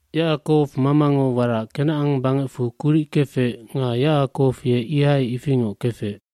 aYacakow mamango warac Kenacan bangecfu kuric kefec nga Yacakow ye ihai ifingoc kefec.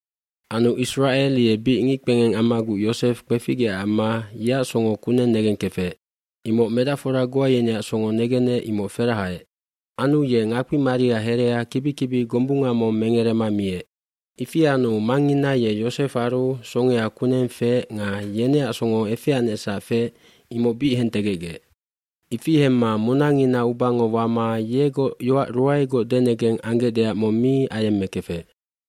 Anu Isracel ye bic ngickpengeng ammaguc Yosef kpeficgeecac amma yeac songo kuneng negengkefec. Imoc medacfora goa yeneac songo negenec imoc ferahaec. Anu ye ngakpi maria herea kibi kibi gombunga mong mengerema miec. bIfi anu mangngina ye Yosefaru songea kuneng feec nga yeneac songo efeanecsac feec imoc bic hentegecgec. Ifi hemma munangina ubango wama yegoc yoac ruaegoc denengeng anggecdeac mong mi ayemmekefec.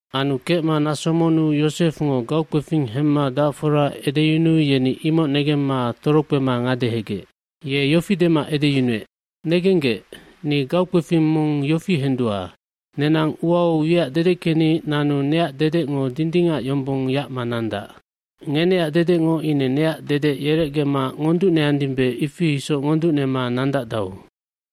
Anu kecma naso monnu Yosefngo gaukpefing hemma dacfora edeyunuu yeni imoc negemma torokpema ngadehegec. Ye yofi dema edeyunuec, “Negenggec, ni gaukpefing mong yofi hendua. Nenang uau wiac dedeckeni nanu neac dedecngo dindingac yombong yacma nandac. Ngeneac dedecngo ine neac dedec yerecgema ngonducneandimbe ifi isoc ngonducnema nandacdau.”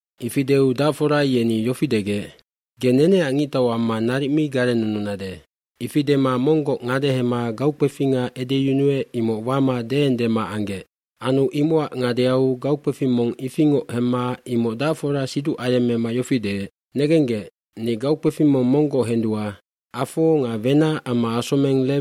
Ifi deu dacfora yeni yofi degec, “Ge neneac ngictau amma naric mi garennununade.” Ifi dema monggoc ngadehema gaukpefinga edeyunuec imoc wama deendema anggec. Anu imocac ngadeau gaukpefing mong ifingoc hemma imoc dacfora siduc ayemmema yofi deec, “Negenggec, ni gaukpefing mong monggoc hendua, afo nga wenac amma asomeng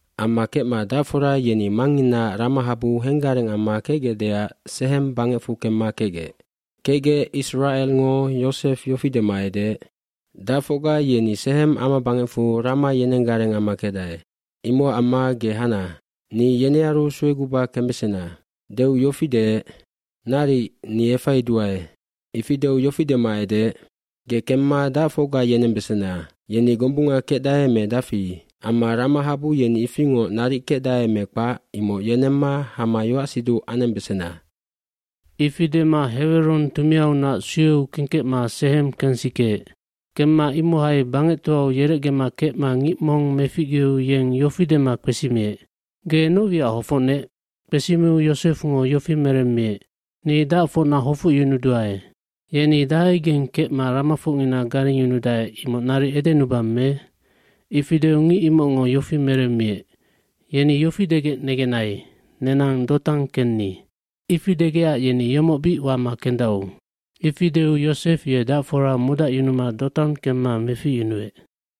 Amma kecma dacfora yeni mangnginaac ramahabu henggareng amma kecgecdeac Sehem bangecfu kemma kecgec. Kecgec Isracelngo Yosef yofi dema edeec, “Dacfocga yeni Sehem amabangecfu rama yenenggareng amma kecdae. Imocac amma ge hana, ni yenearu sueguba kembesena.” Deu yofi deec, “Naric, ni efaiduae.” Ifi deu yofi dema edeec, “Ge kemma dacfocga yenembesena. Yeni gombunga kecdae me dafi? Amma ramahabu yeni ifingoc naric kecdae me kpac imoc yenemma hama yoac siduc anembesena.” Ifi dema Heweron tumiaunac sueu kengkecma Sehem kensikeec. Kemma imohai bangectoau yerecgema kecma ngic mong meficgeu yeng yofi dema kpesimiec, “Ge noc wiac hofocnec?” Kpesimiu Yosefngo yofi meremmiec, “Ni dacfocna hofocyunuduae. Yeni dahaigeng kecma ramafocngina garengyunudae imoc naric edenubang me?” Ifi deu ngic imocngo yofi meremmiec, “Yeni yofi degec negenai, ‘Nenang Dotan kenni.’” Ifi degecac yeni yomoc bic wama kendau. Ifi deu Yosef ye dacfora modacyunuma Dotan kemma meficyunuec.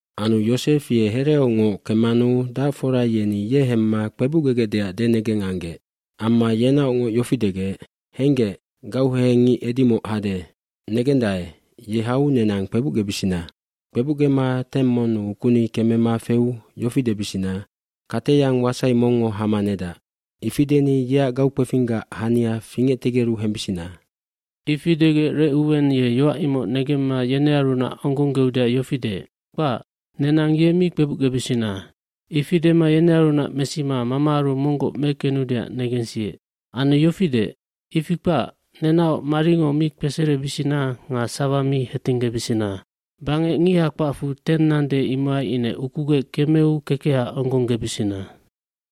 dAnu Yosef ye hereaungoc kemmanu dacfora yeni ye hemma kpebucgegecdeac denegeng anggec. Amma yenaocngoc yofi degec, “Henggec, gauhehengngic edimoc hade. Negendae, ye hau nenang kpebucgebisina. Kpebucgema teng monnu ukuni kemema feu yofi debisina, ‘Kateyang wasai mongngo hama nedac.’ Ifi deni yeac gaukpefinggac hania fingectegeru hembisina.” eIfi degec Recuwen ye yoac imoc negemma yenearunac onggongeudeac yofi deec, “Kpac, nenang ye mi kpebucgebisina.” Ifi dema yenearunac mesima mamaaru monggoc mekenudeac negensiec. Anu yofi deec, “Ifi kpac, nenaoc marininango mi kpeserebisina nga sawa mi hetinggebisina. Bangec ngiha kpacfu teng nande imohai ine ukugec kemeu kekeha onggonggebisina.”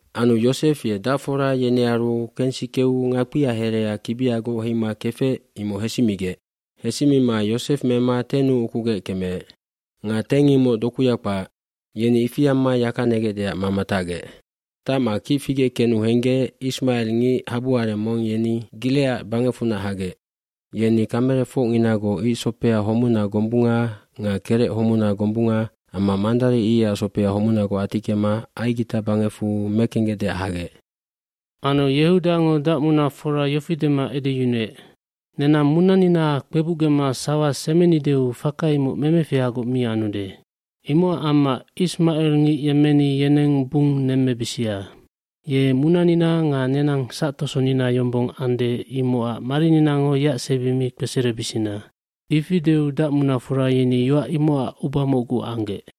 Anu Yosef ye dacfora yenearu kensikeu ngakpia herea kibiagoc heima kefec imoc hesimigec. fHesimima Yosef mema tennu ukugec kemeec. Nga teng imoc dokuya kpac. Yeni ifi amma yaka negecdeac mama tacgec. Tacma kic figec kenu henggec ismacelngic habuareng mong yeni Gilecad bangecfunac hagec. Yeni kamelefocnginagoc icsopea homuna gombunga nga kerec homuna gombunga amma mandari icac sopea homunagoc atickema Aigita bangecfu mekenggecdeac hagec. Anu Yehudango dacmunafora yofi dema edeyunuec, “Nenang munanina kpebucgema sawa semenideu faka imoc memefihagoc mi anude. Imocac amma ismacelngic yemmeni yeneng bung nemmebisia. Ye munanina nga nenang sactosonina yombong ande imocac marininango yeac sebi mi kpeserebisina.” Ifi deu dacmunafora yeni yoac imocac uba mocgu anggec.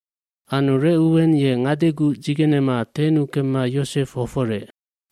hAnu Recuwen ye ngadeguc dzigenema tennu kemma Yosef hoforec.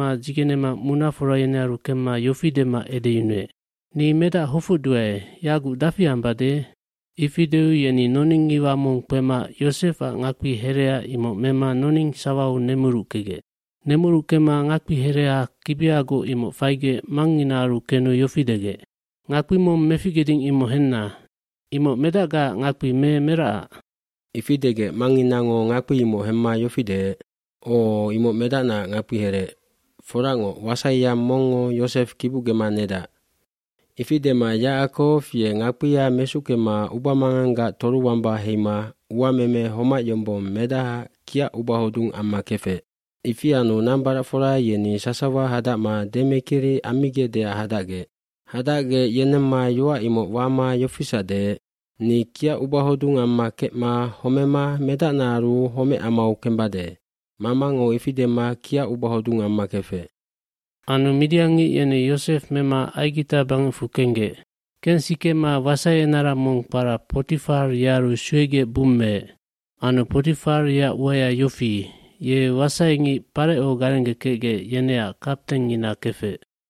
dzigenema munafora yenearu kemma yofi dema edeyunuec, “Ni medac hofocduae, yaguc dafi ambade?” Ifi deu yeni noningngiwa mong kpema Yosefac ngakpi herea imoc mema noning sawau nemurukegec. Nemurukema ngakpihereha kibiagoc imoc faigec mangnginaaru kenu yofi degec, “Ngakpi mong meficgeding imoc henna! Imoc medacgaac ngakpi me meracac?” Ifi degec mangnginango ngakpi imoc hemma yofi deec, “O, imoc medacnaac ngakpiherec. Foracngoc, wasaiyang mongngo Yosef kibucgema nedac.” Ifi dema Yacakow ye ngakpia mesuckema ubamanganggac toruwamba heima uameme homac yombong medahaac kiac ubahodung amma kefec. Ifi anu nambaracfora yeni sasawa hadacma demekiri ammigecdeac hadacgec. Hadacgec yenemma yoac imoc wama yofisac deec, “Ni kiac ubahodung amma kecma homema medacnaaru homecamau kembade.” Mamango ifi dema kiac ubahodung amma kefec. Anu midiangngic yeni Yosef mema Aigita bangecfu kenggec. Kengsikema wasaienara mong kpara Potifar yearu suegec bummeec. Anu Potifar yeac uaya yofi, ye wasaingic Pareco garenggekecgec yeneac kaptengngina kefec.